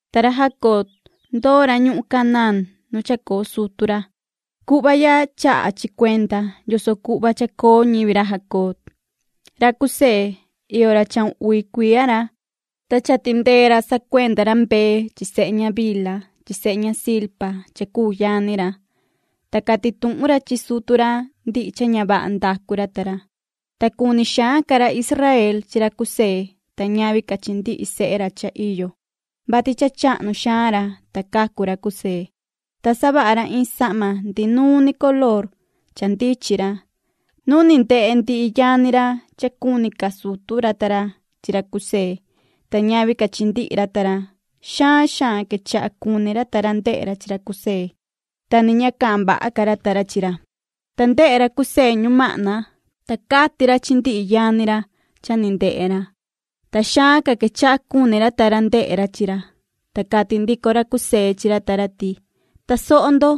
Ta ra Jacob, ndoo ra ñuhun Canaán nu chacoo sutu ra. Cuhva ya chaha chi cuenda yoso cuhva cha chacoo ñivi ra Jacob. Ra José, iyo ra chahun uvi cuiya ra, ta cha tindee ra sacuenda ra mbee chi chivu chi sehe ña Bilha chi sehe ña Zilpa cha cuu yani ra. Ta cati tuhun ra chi sutu ra ndihi cha ña vaha ndacu ra ta ra. Ta cuni xaan ca ra Israel chi ra José ta ñavi ca chi ndihi sehe ra cha iyo, vati cha chahnu xaan ra, ta cacu ra José. Ta savaha ra iin sahma ndihi nuun ni color cha ndichin ra. Nu ni ndehe ndihi yani ra cha cuni ca sutu ra ta ra chi ra José ta ñavi ca chi ndihi ra ta ra, xaan xaan quechaha cuni ra ta ra ndehe ra chi ra José, ta ni ña cahan vaha ca ra ta ra chi ra. Ta ndehe ra José ñumahna, ta cati ra chi ndihi yani ra cha ni ndehe ra, ta xaan ca quechaha cuni ra ta ra ndehe ra chi ra. Ta cati ndico ra José chi ra ta ra ti: ―Tasoho ndo,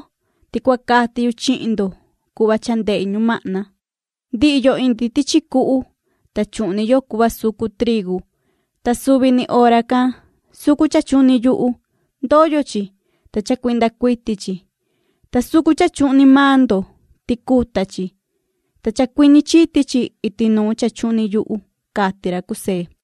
ti cua cati yu chihin ndo cuhva cha ndehi ñumahna. Ndihi yo indi tichi cuhu, ta chuhni yo cuhva sucu trigu, ta suvi ni hora can sucu cha chuhni yuhu. Ndoyo chi, ta chacuinda cuiti chi, ta sucu cha chuhni maan ndo, ticuta chi, ta chacuiñi chiti chi iti nuun cha chuhni yuhu ―cati ra José.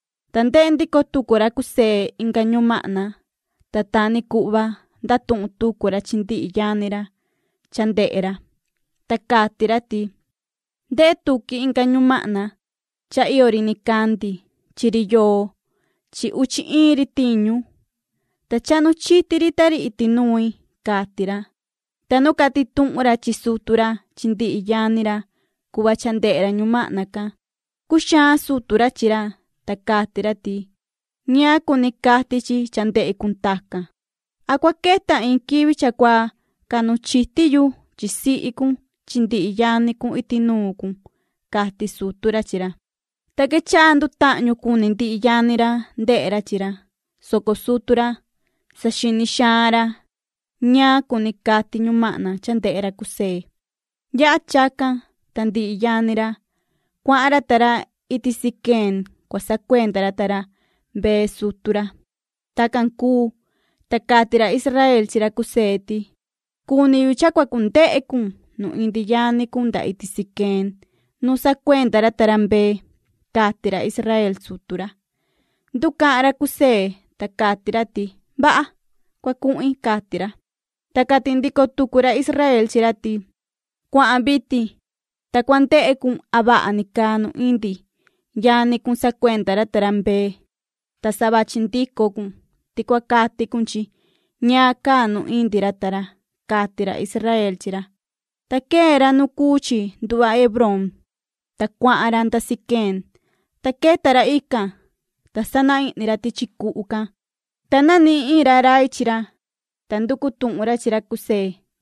Ta ndehe ndico tucu ra José inga ñumahna, ta ta ni cuhva ndatuhun tucu ra chi ndihi yani ra cha ndehe ra. Ta cati ra ti: ―Ndehe tuqui inga ñumahna cha iyo ri nicandi chi ri yoo chi uchi iin ri tiñu, ta chahnu chiti ri ta ri iti nui ―cati ra. Ta nu cati tuhun ra chi sutu ra chi ndihi yani ra cuhva cha ndehe ra ñumahna can, cuxaan sutu ra chi ra, ta cati ra ti: ―¿Ñaan cuni cati chi cha ndehe cun tacan? ¿An cua queta iin quivi cha cua cahnu chiti yu chi sihi cun chi ndihi yani cun iti nuun cun? ―cati sutu ra chi ra. Ta quechaha ndutahñu cuni ndihi yani ra ndehe ra chi ra, soco sutu ra, saxini xaan ra ñaan cuni cati ñumahna cha ndehe ra José. Yaha chacan, ta ndihi yani ra, cuahan ra ta ra iti Siquem cua sacuenda ra ta ra mbee chi chivu sutu ra. Tacan cuu, ta cati ra Israel chi ra José ti: ―Cuni yu cha cua cundehe cun nu indi yani cun nda iti Siquem nu sacuenda ra ta ra mbee ―cati ra Israel sutu ra. Nducahan ra José, ta cati ra ti: ―Vaha, cua cuhin ―cati ra. Ta cati ndico tucu ra Israel chi ra ti: ―Cuahan vitin, ta cua ndehe cun a vaha ni caa nu indi yani cun sacuenda ra ta ra mbee chi chivu. Ta sa vachi ndico cun ti cua cati cun chi ñaan caa nu indi ra ta ra ―cati ra Israel chi ra. Ta quee ra nu cuu chi nduhva Hebrón, ta cuahan ra nda Siquem, ta queta ra ican. Ta sana ihni ra tichi cuhu can, ta nanihin iin ra rai chi ra, ta nducu tuhun ra chi ra José,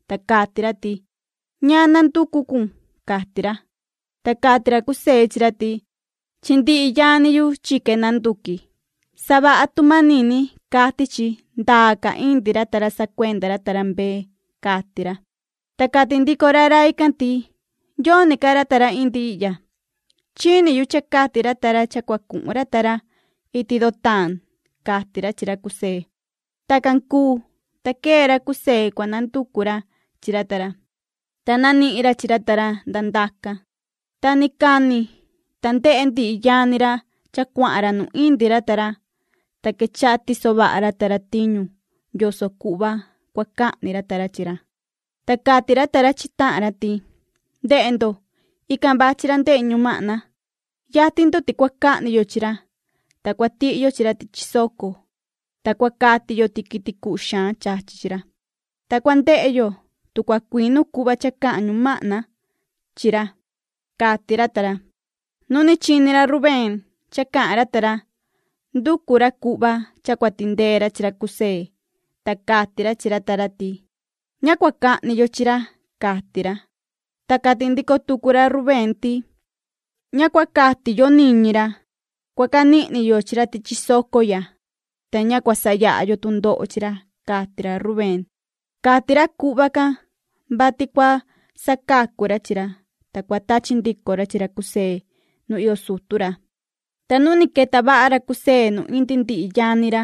ta cati ra ti: ―¿Ñaan nanducu cun? ―cati ra. Ta cati ra José chi ra ti: ―Chi ndihi yani yu chique nanduqui. Savaha tu manini cati chi ndaa ca indi ra ta ra sacuenda ra ta ra mbee ―cati ra. Ta cati ndico ra rai can ti: ―Yoni ca ra ta ra indi ihya. Chini yu cha cati ra ta ra cha cua cuhun ra ta ra iti Dotaan ―cati ra chi ra José. Tacan cuu, ta quee ra José cua nanducu ra chi ra ta ra, ta nanihin ra chi ra ta ra nda ndacan. Ta ni cani ta ndehe ndihi yani ra cha cuahan ra nu indi ra ta ra, ta quechaha tiso vaha ra ta ra tiñu yoso cuhva cua cahni ra ta ra chi ra. Ta cati ra ta ra chi tahan ra ti: ―Ndehe ndo, ican vachi ra ndehe ñumahna. Yatin ndo ti cua cahni yo chi ra, ta cua tihi yo chi ra tichi soco, ta cua cati yo ti quiti cuhu xaan chachi chi ra. Ta cua ndehe yo tu cha cua cuinu cuhva cha cahan ñumahna chi ra ―cati ra ta ra. Nu ni chini ra Rubén cha cahan ra ta ra nducu ra cuhva cha cua tindee ra chi ra José, ta cati ra chi ra ta ra ti: ―Ña cua cahni yo chi ra ―cati ra. Ta cati ndico tucu ra Rubén ti: ―Ña cua cati yo niñi ra. Cua canihni yo chi ra tichi soco ya, ta ña cua sayaha yo tundoho chi ra ―cati ra Rubén. Cati ra cuhva can, vati cua sacacu ra chi ra, ta cua tachi ndico ra chi ra José nu iyo sutu ra. Ta nu ni queta vaha ra José nu indi ndihi yani ra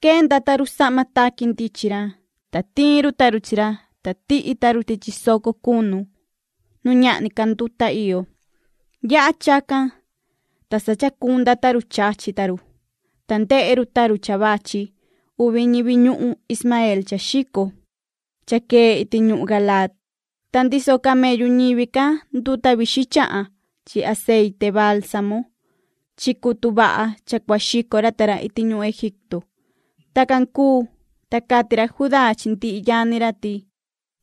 quenda ta run sahma taqui ndichin ra. Ta tiin ta run chi ra, ta tihi ta run tichi soco cunu nu ñahni ca nduta iyo. Yaha chacan, ta sa chacunda ta run chachi ta run, ta ndehe run ta run cha vachi uvi ñivi ñuhun Ismaeel cha xico, cha quee iti ñuhun Galaad. Ta ndiso camellu ñivi can nduta vixin chahan chi aceite baalsamo chi cutu vaha cha cua xico ra ta ra iti ñuhun Egipto. Tacan cuu, ta cati ra Judá chi ndihi yani ra ti: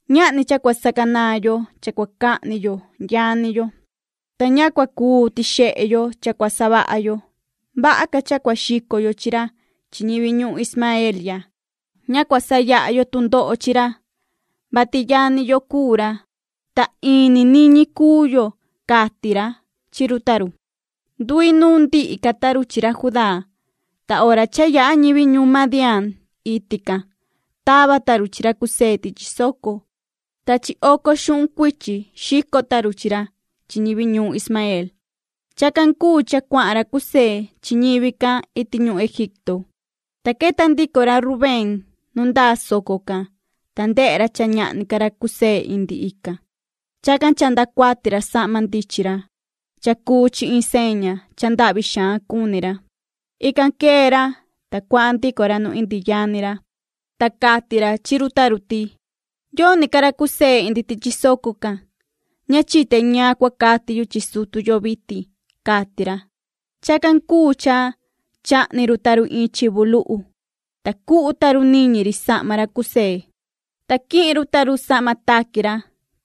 ―Ñahni cha cua sacanaan yo cha cua cahni yo yani yo, ta ña cua cuu tixehe yo cha cua savaha yo. Vaha ca cha cua xico yo chi ra chi ñivi ñuhun Ismaeel ya. Ña cua sayaha yo tundoho chi ra, vati yani yo cuu ra, ta in ni niñi cuu yo ―cati ra chi run ta run. Nduinuun ndihi ca ta run chi ra Judá. Ta hora cha yaha ñivi ñuhun Madián iti can tava ta run chi ra José tichi soco, ta chi oco xuhun cuichi xico ta run chi ra chi ñivi ñuun Ismaeel. Chacan cuu cha cuahan ra José chi ñivi can iti ñuhun Egipto. Ta queta ndico ra Rubén nu ndaa soco can, ta ndehe ra cha ñahni ca ra José indi ican. Chacan chahnda cuati ra sahma ndichin ra. Cha cuu chi iin seña cha ndahvi xaan cuni ra. Ican quee ra, ta cuahan ndico ra nu indi yani ra, ta cati ra chi run ta run ti: ―Yoni ca ra José indi tichi soco can. Ña chite ñaan cua cati yu chi sutu yo vitin ―cati ra. Chacan cuu cha chahni run ta run iin chivu luhu, ta cuhu ta run niñi ri sahma ra José. Ta quihin run ta run sahma taqui ra,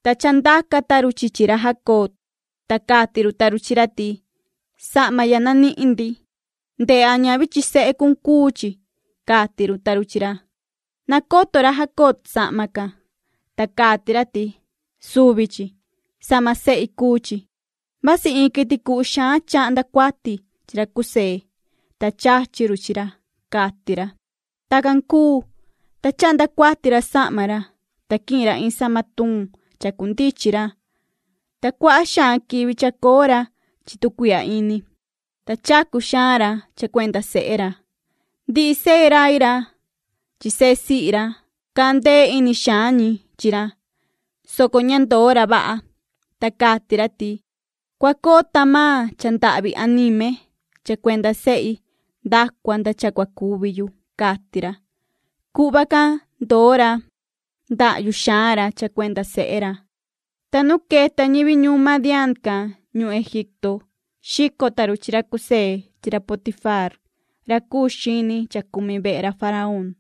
ta chandaca ta run chi chi ra Jacob, ta cati run ta run chi ra ti:” Sahma ya nanihin ndi. Ndehe a ñavi chi sehe cun cuu chi”, cati run ta run chi ra. Nacoto ra Jacob sahma can, ta cati ra ti:” Suvi chi. Sahma sehi cuu chi. Vasi iin quiti cuhu xaan chahnda cuati chi ra José, ta chachi run chi ra”, cati ra. Tacan cuu, ta chahnda cuati ra sahma ra, ta quihin ra iin sahma tuun chacundichin ra, ta cuaha xaan quivi chacoo ra chi tu cuihya ini, ta chacu xaan ra cha cuenda sehe ra. Ndihi sehe rai ra chi sehe sihi ra, cahan ndee ini xaan ñi chi ra, soco ña ndoo ra vaha, ta cati ra ti: “Cua coo tahan maan cha ndahvi anime cha cuenda sehi nda cua nda cha cua cuvi yu”, cati ra. Cuhva can ndoo ra ndahyu xaan ra cha cuenda sehe ra. Ta nu queta ñivi ñuhun Madián can ñuhun Egipto xico ta run chi ra José chi ra Potifaar ra cuu xini cha cumi vehe ra faraón.